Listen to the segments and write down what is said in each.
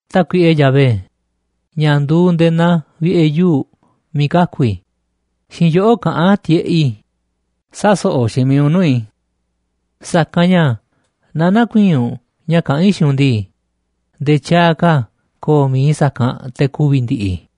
Tákuiꞌe Yahvé, ña̱ nduuꞌ nde̱e̱ naa vi̱ꞌe̱ yuu̱ꞌ miiꞌ kaku̱ i̱, xiinꞌ yoꞌó kaꞌán tiꞌeꞌ i̱, sä̱soꞌoꞌ xiinꞌ miiꞌ u̱nꞌ nuu̱ꞌ i̱. Sa̱kanꞌ ña̱ naaꞌ nä̱ku̱i̱i̱n u̱nꞌ ña̱ kaꞌán i̱ xiinꞌ u̱nꞌ ndii, nde̱e̱ tyaaꞌ ka̱ ko̱o̱ mi̱iꞌ i̱ sa̱kanꞌ te̱ ku̱vi̱ ndi̱ꞌi̱ i̱.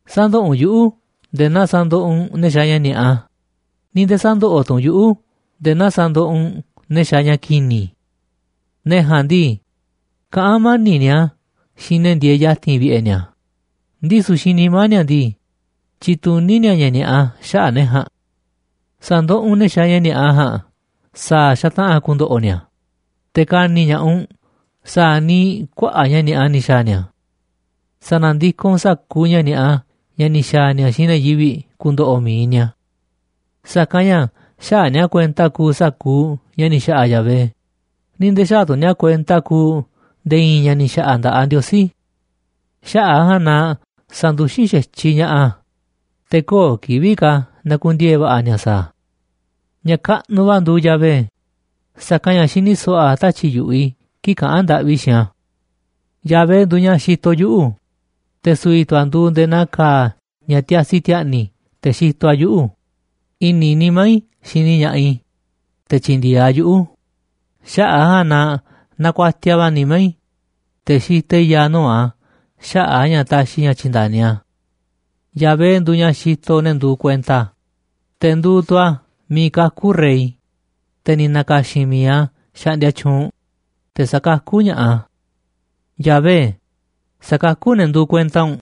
Sä̱ndoꞌoꞌ u̱nꞌ yuꞌu̱ nde̱e̱ naa sandoꞌoꞌ u̱nꞌ ne̱ xaaꞌ ña̱ ni̱a̱ꞌa, ni̱ nde̱e̱ sä̱ndoꞌoꞌ tu̱ u̱nꞌ yuꞌu̱ nde̱e̱ naa sandoꞌoꞌ u̱nꞌ ne̱ xaaꞌ ña̱ ki̱ni̱. Ne̱ ja̱a̱nꞌ ndii, kaꞌán mani̱ꞌ ni̱a̱ xiinꞌ ne̱ ndieeꞌ ya̱ti̱n vi̱ꞌe̱ ni̱a̱, ndisu̱ xiinꞌ nimá ni̱a̱ ndii, tyituní ni̱a̱ ña̱ ni̱a̱ꞌa xaꞌa̱ꞌ ne̱ ja̱a̱nꞌ. Sa̱ndoꞌoꞌ u̱nꞌ ne̱ xaaꞌ ña̱ ni̱a̱ꞌa ja̱a̱nꞌ sa̱a̱ xataꞌa̱n ku̱ndo̱ꞌo̱ ni̱a̱, te̱ ka̱ni̱ ña̱ꞌaꞌ u̱nꞌ sa̱a̱ niiꞌ kuaꞌa̱ꞌ ña̱ ni̱a̱ꞌa ni̱ xa̱a̱ ni̱a̱. Sa̱na̱ndikoꞌ u̱nꞌ sa̱kuuꞌ ña̱ ni̱a̱ꞌa ña̱ ni̱ xa̱a̱ ni̱a̱ xiinꞌ ne̱ yivi̱ꞌ ku̱ndo̱ꞌo̱ mi̱iꞌ ni̱a̱. Sa̱kanꞌ ña̱ xäaꞌ ni̱a̱ kuenta kuuꞌ sa̱kuuꞌ ña̱ ni̱ xa̱ꞌa̱ Yahvé, ni̱ nde̱e̱ xäaꞌ tu̱ ni̱a̱ kuenta kuuꞌ nde̱e̱ i̱i̱n ña̱ ni̱ xa̱ꞌa̱ nda̱ꞌaꞌ Ndiosí. Xaꞌa̱ꞌ a̱ ja̱a̱nꞌ na sa̱nduxín xa̱tyiꞌ ña̱ꞌaꞌ a̱, te̱ köo̱ꞌ kivi̱ꞌ ka̱ na̱ku̱ndiee̱ va̱ꞌa̱ ni̱a̱ sa̱a̱ a̱. Ña̱ kaꞌnuꞌ va̱ nduuꞌ Yahvé, sa̱kanꞌ ña̱ xini so̱ꞌo̱ a̱ tatyi̱ꞌ yu̱ꞌuꞌ i̱ kii̱ꞌ kaꞌán ndaꞌvi i̱ xiinꞌ a̱. Yahvé nduuꞌ ña̱ xitoꞌ yuꞌu̱, te̱ su̱vi̱ tu̱ a̱ nduuꞌ nde̱e̱ naa ka̱a̱ ña̱ tiasi ti̱a̱ꞌni̱ i̱ te̱ xitoꞌ a̱ yuꞌu̱, i̱ni̱ nimá i̱ xi̱ni̱ ña̱ꞌaꞌ i̱, te̱ tyi̱ndi̱e̱eꞌ a̱ yuꞌu̱. Xaꞌa̱ꞌ a̱ ja̱a̱nꞌ na nakuatiaꞌ va̱ nimá i̱, te̱ xitaꞌ i̱ ya̱a̱ nuu̱ꞌ a̱ xaꞌa̱ꞌ a̱ ña̱ taxiꞌ i̱ ña̱ tyi̱nda̱ni a̱. Yahvé nduuꞌ ña̱ xitoꞌ ne̱ nduuꞌ kuenta a̱, te̱ nduuꞌ tu̱ a̱ miiꞌ kaku̱ rey, te̱ ni̱ na̱ka̱xi̱n mi̱iꞌ a̱ xaꞌndia tyuunꞌ, te̱ sakakú ña̱ꞌaꞌ a̱. Yahvé, sa̱kakú ne̱ nduuꞌ kuenta u̱nꞌ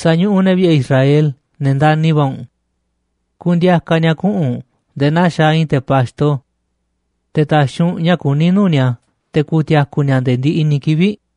sa̱ñuꞌuꞌ ne̱ vi̱ꞌe̱ Israel, ne̱ ndani̱ va̱ u̱nꞌ. Ku̱ndi̱a̱ka̱ ni̱a̱ kuꞌu̱n u̱nꞌ nde̱e̱ naa xaaꞌ i̱i̱n te̱ pa̱xto, te̱ ta̱xi̱ u̱nꞌ ña̱ kuní nuu̱ꞌ ni̱a̱ te̱ ku̱ti̱a̱ku̱ ni̱a̱ nde̱e̱ ndiꞌiꞌ ni̱ kivi̱ꞌ.